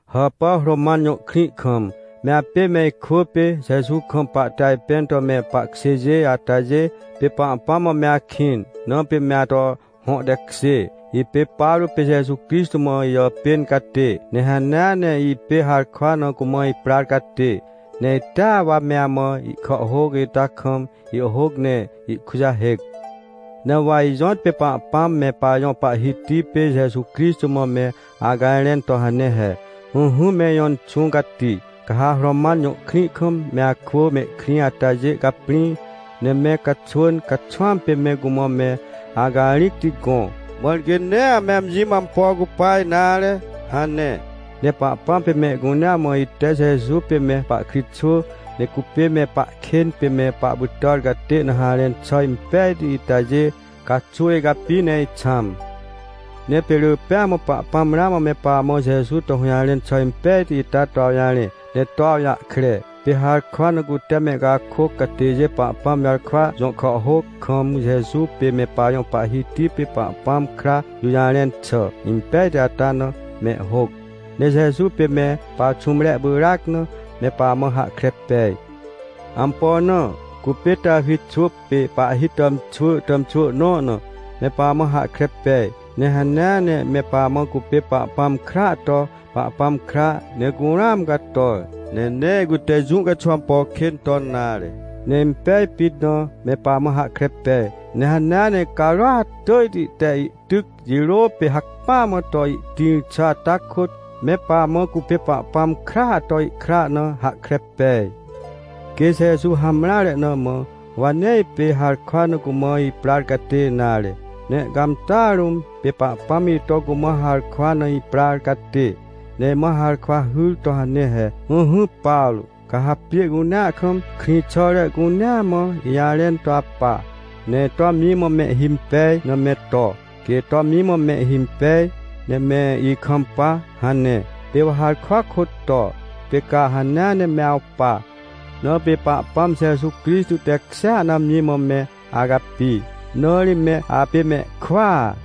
Hàpà Roman jõ krĩ kam, me apê me ikwỳ pê, Jeju kam, pahte ajpẽn to me pahkjêjê atajê. Pê Pahpãm mã me akĩn, na pê me ato hõ tekjê. Ipê Pawrô pê Jeju Crixtô mã ijàpên catê, ne hanea ne ipê harkwa na cumã iprar catê. Ne itea wa me amã ihkàhhôc ita kam ihhôc ne ihkujahêc. Ne wa ijõtpê Pahpãm me Pajõ Pahhiti pê Jeju Crixtô mã me acajrẽn to hane he: — Ỹhỹ, me ijõ Inxũ Cati, ca ha Roman jõ krĩ kam, me akwỳ mehkrĩ atajê caprĩ, ne me caxwỳn caxwãm pê me cumã me acarĩcti gõ, mãr quê nee ame amji mã ampo cupa nare — hane. Ne Pahpãm pê mehcunea mã, ite Jeju pê me pahkritxwỳ, ne cupê me pahkên pê me pahpytàr catê na harẽn xà impejti itajê caxuw icapi ne ixãm. Ne pê rỳ pêa mã, Pahpãm ramã me pamã Jeju to hũjarẽn xà impejti ita to awjarẽ, ne to awjahkre. Pê harkwa na cute mehcakôc catêjê Pahpãm jarkwa jõ kàhhôc kam, Jeju pê me pajõ Pahhiti pê Pahpãm kra jũjarẽn xà impejti ata na mehhôc. Ne Jeju pê me paxũmrea pyràc na, me pamã hahkre pej. Ampo na? Cupê Tawi xwỳ pê pahhi tàmxwỳ tàmxwỳ nõ na, me pamã hahkre pej. Ne hanea ne me pamã, cupê Pahpãm kraa to Pahpãm kra, ne curũam cator, ne nee cute jũ caxuw ampo kên ton nare, ne impej pit na, me pamã hahkre pej. Ne hanea ne carôat tỳjti te ihtyc jirô pê hacpỹa mã to ihtĩr xà ata kôt, me pamã cupê Pahpãm kraa to ihkra na hahkre pej. Quê Jeju hamreare na mã, wa nee ipê harkwa na cumã iprar catê nare. Ne ihcãmtàa rũm, pê Pahpãm ito cumã harkwa na iprar catê, ne imã harkwa hyr to hane he: — Ỹhỹ, Pawrô, ca ha pjê cunea kam, krĩxàre cunea mã, ijarẽn to apa, ne ito amji mã mehhimpej na me to, quê ito amji mã mehhimpej, ne me ikampa — hane. Pê wa harkwa kôt to, pê ca hanea ne me awpa, na pê Pahpãm Jeju Crixtô tekjêa na amji mã me acapi. Na ri me apê mehkwỳa.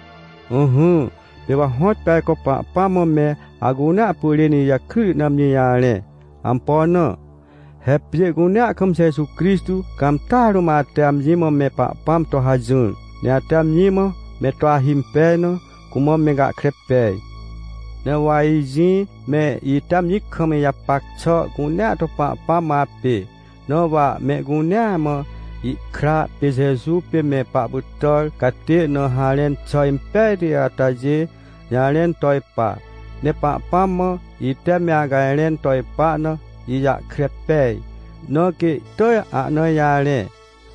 Ỹhỹ, pê wa hõtpê ajco Pahpãm mã me acunea pyrên ijakryti na amji jarẽ. Ampo na? He pjê cunea kam Jeju Crixtô cãmtàa rũm ate amji mã me Pahpãm to hajỹr, ne ate amji mã me to ahimpej na, cumã me gahkre pej. Ne wa ijĩ me ite amji kam ijapac xà cunea to Pahpãm mã apê, na wa mehcunea mã ihkra pê Jeju pê me pahpytàr catê na harẽn xà impejti atajê jarẽn to ipa. Ne Pahpãm mã, ite me acajrẽn to ipa na ijahkre pej, na quê ihtỳj ahna ijarẽ.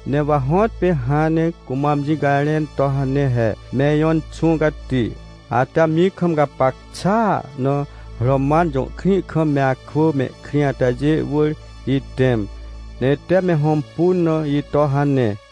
Ne wa hõtpê hãn ne cumã amji cajrẽn to hane he: — Me ijõ Inxũ Cati, ate amji kam gapac xàa na Roman jõ krĩ kam me akwỳ mehkrĩ atajê wỳr itẽm, ne ite me hõmpun na ito — hane.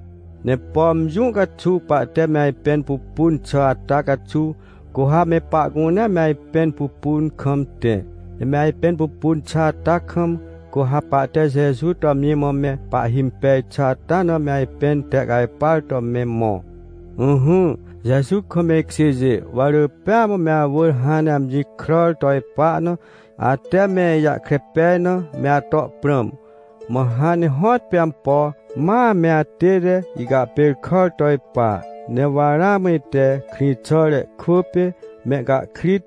Ne pom jũ caxuw pahte me ajpẽn pupun xà ata caxuw, cu ha me pahcunea me ajpẽn pupun kam tẽ. Ne me ajpẽn pupun xà ata kam, cu ha pahte Jeju to amji mã me pahhimpej xà ata na me ajpẽn tehcajpar to me mõ. Ỹhỹ, Jeju kam me ikjêjê, wa rỳ pêa mã me awỳr hãn ne amji kràr to ipa na, ate me ijahkre pej na, me ato prãm. Mã hãn ne hõtpê ampo, ma me atête icahpêrkàr to ipa. Ne wa ramã ite krĩxàre kwỳ pê mehcahkrit,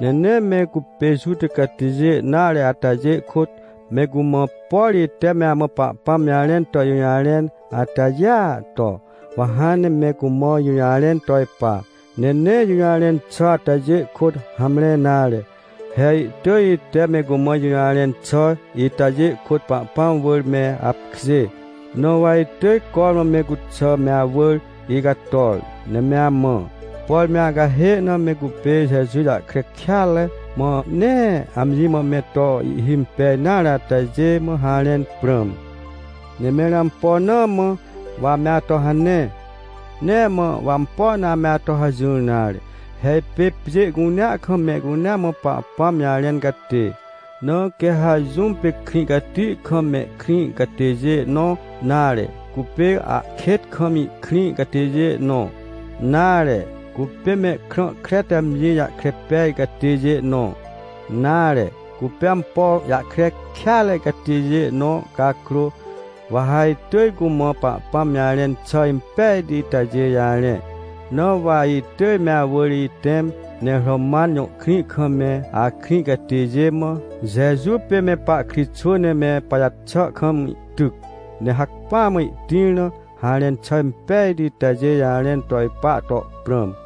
ne nee me cupê Juta catêjê nare atajê kôt, me cumã, por ite me amã Pahpãm jarẽn to ijũjarẽn atajêa to, wa hãn ne me cumã ijũjarẽn to ipa. Ne nee ijũjarẽn xà atajê kôt hamre nare. He ihtỳj ite me cumã ijũjarẽn xà itajê kôt Pahpãm wỳr me apkjê. Na wa itỳj cormã me cuxà me awỳr icator, ne me amã, por me acahê na me cupê Jeju jahkre kêatre, mã nee amji mã me to ihhimpej nare atajê mã harẽn prãm. Ne mẽr ampo na mã wa ame ato hane? Nee mã wa ampo na ame ato hajỹr nare. He ipê pjê cunea kam mehcunea mã Pahpãm jarẽn catê, na quê ha jũm pê krĩ cati kam mehkrĩ catêjê nõ, nare, cupê ahkêt kam ihkrĩ catêjê nõ, nare, cupê mehkrã kre te amji jahkre pej catêjê nõ, nare, cupê ampo jahkre kêatre catêjê nõ cakrô, wa ha itỳj cumã Pahpãm jarẽn xà impejti itajê jarẽ. Na wa itỳj me awỳr itẽm, ne Roman jõ krĩ kam me akrĩ catêjê mã, Jeju pê me pahkritxwỳ ne me pajaxà kam ihtyc, ne hacpỹa mã ihtĩr na harẽn xà impejti itajê jarẽn to ipa to prãm.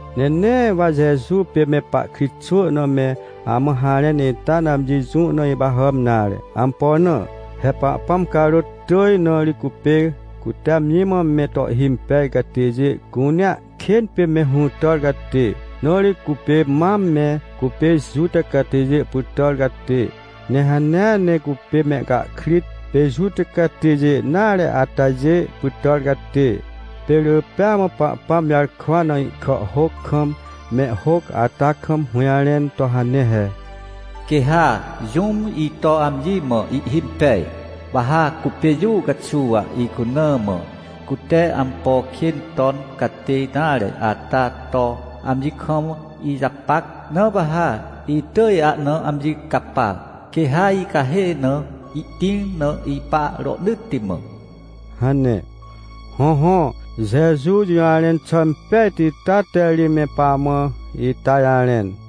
Ne nee wa Jeju pê me pahkritxwỳ na me amã harẽn ita na amji jũ na ipahàm nare. Ampo na? He Pahpãm carôt tỳj na ri cupê, cute amji mã me to ihhimpej catêjê cunea kên pê me hũtàr catê. Na ri cupê mam me cupê Juta catêjê pytàr catê, ne hanea ne cupê mehcahkrit, pê Juta catêjê nare atajê pytàr catê. Pê rỳ pêa mã Pahpãm jarkwa na ihkàhhôc kam, mehhôc ata kam, hũjarẽn to hane he: “Quê ha jũm ito amji mã ihhimpej, wa ha, cupê jũ caxuw icuna mã, cute ampo kên ton catê nare ata to amji kam ijapac. Na wa ha itỳj ahna amji capa, quê ha icahê na ihtĩr na ipa rohnỳtti mã” hane. Hõhõ, Jeju jũjarẽn xà impejti ita te ri me pamã ita jarẽn.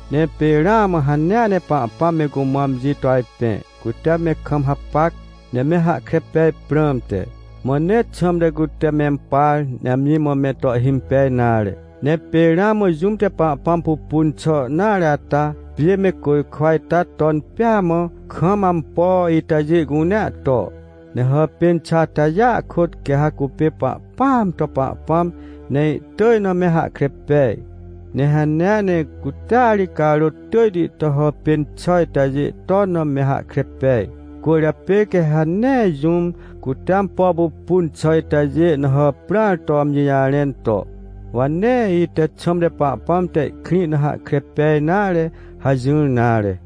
Ne pê ramã hanea ne Pahpãm me cumã amji to ajpẽ, cute me kam hapac, ne me hahkre pej prãmte. Mã nee xãmte cute mempar, ne amji mã me to ihhimpej nare. Ne pê ramã jũm te Pahpãm pupun xà nare ata, pjê me côjkwa ita ton pêa mã, kam ampo itajê cunea to. Ne hàpên xà atajêa kôt, quê ha cupê Pahpãam to Pahpãm, ne ihtỳj na me hahkre pej. Ne hanea ne cutea ri carôt tỳjti to hàpên xà itajê ton na me hahkre pej. Cwỳrjapê quê ha nee jũm, cute ampo pupun xà itajê na hàprãr to amji jarẽn to: — Wa nee ite xãmte Pahpãm te ihkrĩ na hahkre pej nare — hajỹr nare.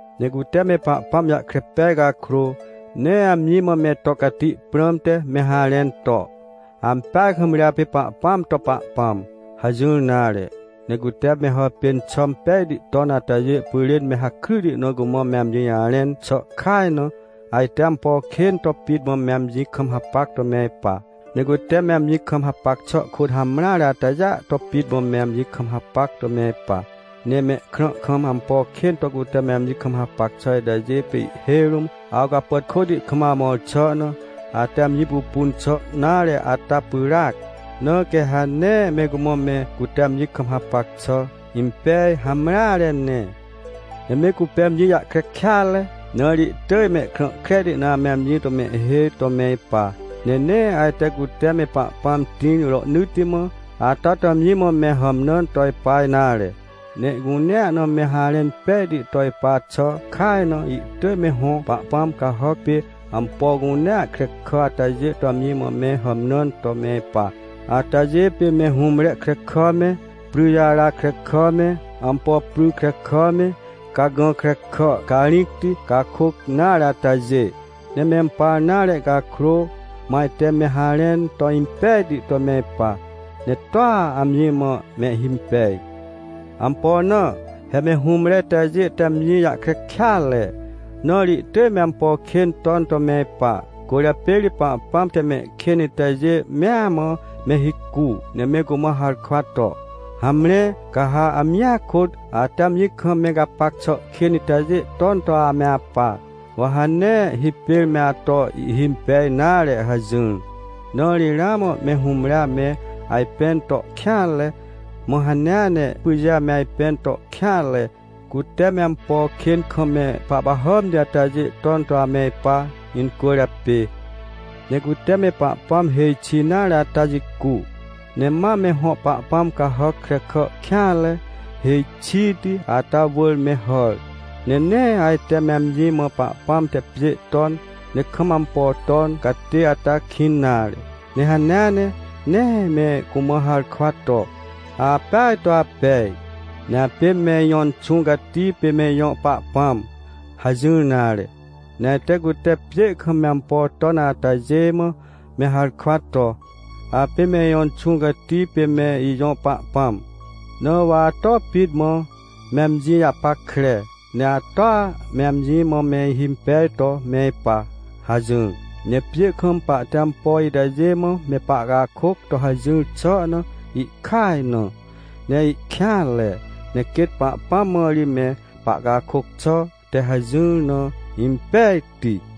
Ne cute me Pahpãm jahkre pej cakrô, nee amji mã me to cati prãmte me harẽn to: — Ampeaj kam ri apê Pahpãam to Pahpãm — hajỹr nare. Ne cute me hàpên xà pejti ton atajê pyrên me hakryti na cumã me amji jarẽn xà kaj na, ajte ampo kên to pit mã me amji kam hapac to me ipa. Ne cute me amji kam hapac xà kôt hamreare atajêa to pit mã me amji kam hapac to me ipa. Ne mehkrã kam ampo kên to cute me amji kam hapac xà itajê pê ihhêj rũm awcapàtkôti kam amõr xà na, ate amji pupun xà nare ata pyràac, na quê ha nee me cumã me cute amji kam hapac xà impej hamreare ne. Ne me cupê amji jahkre kêatre, na ri ihtỳj mehkrã kreti na ame amji to mehhêj to me ipa. Ne nee ajte cute me Pahpãm tĩr rohnỳtti mã ata to amji mã me hàmnãn to ipa nare, ne ihcunea na me harẽn pejti to ipa xà kaj na, ihtỳj me hõ pahpãm cahàc pê, ampo cunea krekà atajê to amji mã me hàmnãn to me ipa. Atajê pê me hũmre krekà me, pryjara krekà me, ampo pry krekà me, cagã krekà carĩcti, cakôc nare atajê, ne mempar nare cakrô, mã ajte me harẽn to impejti to me ipa, ne toa amji mã mehhimpej. Ampo na? He me hũmre itajê te amji jahkre kêatre, na ri ihtỳj me ampo kên ton to me ipa, cwỳrjapê ri Pahpãm te mehkên itajê mea mã me hicu, ne me cumã harkwa to: “Hamre, ca ha amjia kôt, ate amji kam me gapac xà kên itajê ton to ame apa, wa ha nee hipêr me ato ihimpej nare” hajỹr. Na ri ramã me hũmre ame ajpẽn to kêanre, mã hanea ne pyjê ame ajpẽn to kêanre, cute me ampo kên kam me pahpahàmti atajê ton to ame ipa incwỳrjapê. Ne cute me Pahpãm hêj xi nare ata jicu, ne ma me hõ Pahpãm cahàc krekà kêanre hêj xiti ata wỳr me hàr. Ne nee ajte me amji mã Pahpãm te pjê ton, ne kam ampo ton catê ata kĩn nare. Ne hanea ne, nee me cumã harkwa to: — Apeaj to apej, ne apê me ijõ Inxũ Cati pê me ijõ Pahpãm — hajỹr nare. Ne ajte cute pjê kam me ampo ton atajê mã me harkwa to: — Apê me ijõ inxũ cati pê me ijõ pahpãm, na wa ato pit mã, me amji japackre, ne atoa me amji mã me ihimpej to me ipa — hajỹr. Ne pjê kam pahte ampo itajê mã me pahcakôc to hajỹr xà na ihkaj na, ne ihkêanre, ne quêt Pahpãm mã ri me pahcakôc xà te hajỹr na impejti.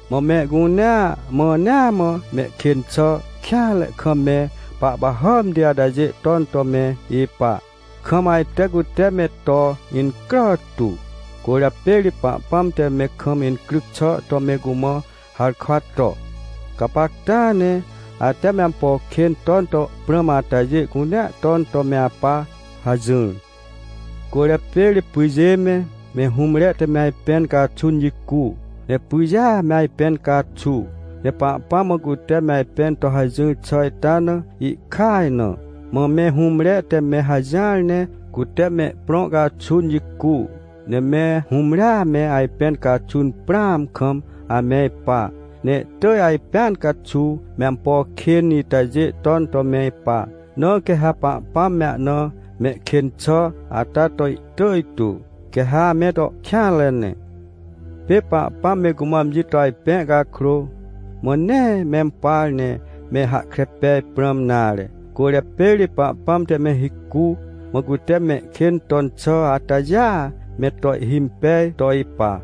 Mã mehcunea mãnea mã mehkên xà kêanre kam me pahpahàmti atajê ton to me ipa, kam ajte cute me to incrà tu. Cwỳrjapê ri Pahpãm te me kam incryc xà to me cumã harkwa to: “Gapacta ne, ate me ampo kên ton to prãm atajê cunea ton to me apa” hajỹr. Cwỳrjapê ri pyjê me, me hũmre te me ajpẽn caxun jicu, ne pyjêa me ajpẽn caxu. Ne Pahpãm mã cute me ajpẽn to hajỹr xà ita na ihkaj na. Mã me hũmre te me hajỹar ne cute mehprõ caxun jicu, ne me hũmrea me ajpẽn caxun prãam kam ame ipa. Ne ihtỳj ajpẽn caxuw me ampo kên itajê ton to me ipa, na quê ha Pahpãm me ahna mehkên xà ata to ihtỳj tu, quê ha ame to kêanre ne. Pê Pahpãm me cumã amji to ajpẽ cakrô, mã nee mempar, ne me hahkre pej prãm nare. Cwỳrjapê ri Pahpãm te me hicu, mã cute mehkên ton xà atajêa me to ihhimpej to ipa.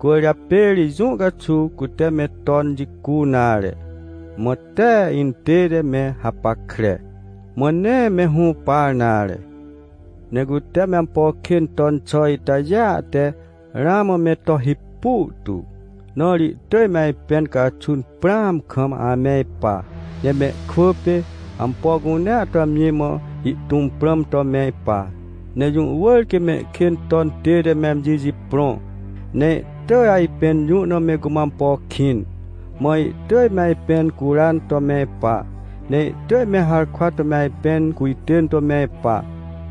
Cwỳrjapê ri jũ caxuw cute me ton jicu nare. Mã tee intête me hapackre, mã nee me hũpar nare. Ne cute me ampo kên ton xà itajêa te ramã me to hipu tu, na ri ihtỳj me ajpẽn caxun prãam kam ame ipa. Ne mehkwỳ pê, ampo cunea to amji mã ihtũm prãm to me ipa. Ne jũ wỳr quê mehkên ton tête me amji jiprõ, ne ihtỳj ajpẽn jũ na me cumã ampo kĩn. Mã ihtỳj me ajpẽn curan to me ipa. Ne ihtỳj me harkwa to me ajpẽn cujtên to me ipa,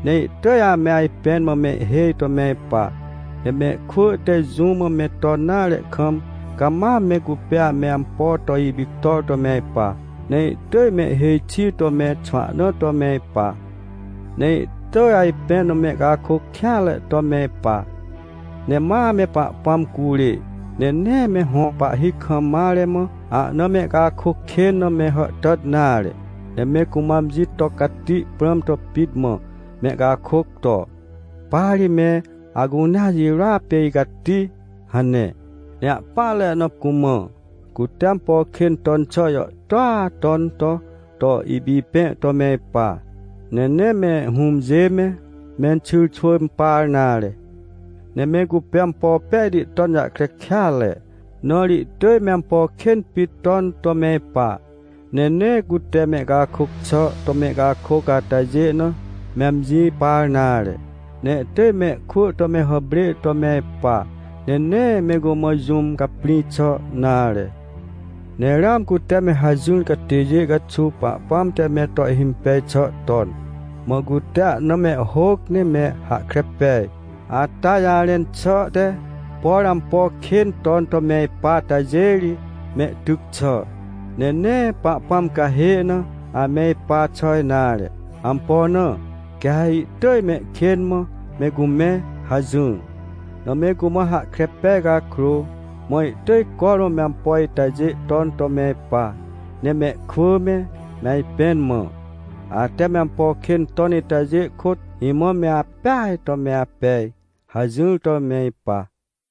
ne ihtỳj ame ajpẽn mã ihhêj to me ipa. Ne mehkwỳ te jũ mã me ton nare kam, cama me cupê ame ampo to ipictor to me ipa. Ne ihtỳj mehhêj xi to me xwahna to me ipa. Ne ihtỳj ajpẽn na mehcakôc kêanre to me ipa. Ne ma ame Pahpãm curê, ne nee me hõ pahhi kam mare mã, ahna mehcakôc kên na me hàhtàt nare, ne me cumã amji to cati prãm to pit mã, mehcakôc to: — Pa ri me acunea jirôa pê icati — hane. Ne ahpỹanre na cumã, cute ampo kên ton xà jàhtôa ton to, to ipipẽ to me ipa, ne nee me hũmjê me, menxyrxwỳ impar nare. Ne me cupê ampo pejti ton jahkre kêatre, na ri ihtỳj me ampo kên pit ton to me ipa. Ne nee cute mehcakôc xà to mehcakôc atajê na, me amji par nare. Ne ihtỳj mehkwỳ to me hàprê to me ipa, ne nee me cumã jũm caprĩ xà nare. Ne ramã cute me hajỹr catêjê caxuw Pahpãm te me to ihhimpej xà ton, mã cute ahna mehhôc ne me hahkre pej, ata jarẽn xà te: “Por ampo kên ton to me ipa atajê ri mehtyc xà, ne nee Pahpãm cahê na ame ipa xà nare. Ampo na? Quê ha ihtỳj mehkên mã me cumẽ” hajỹr. Na me cumã hahkre pej cakrô, mã ihtỳj cormã me ampo itajê ton to me ipa, ne mehkwỳ me, me ajpẽn mã: — Ate me ampo kên ton itajê kôt, imã me apeaj to me apej — hajỹr to me ipa.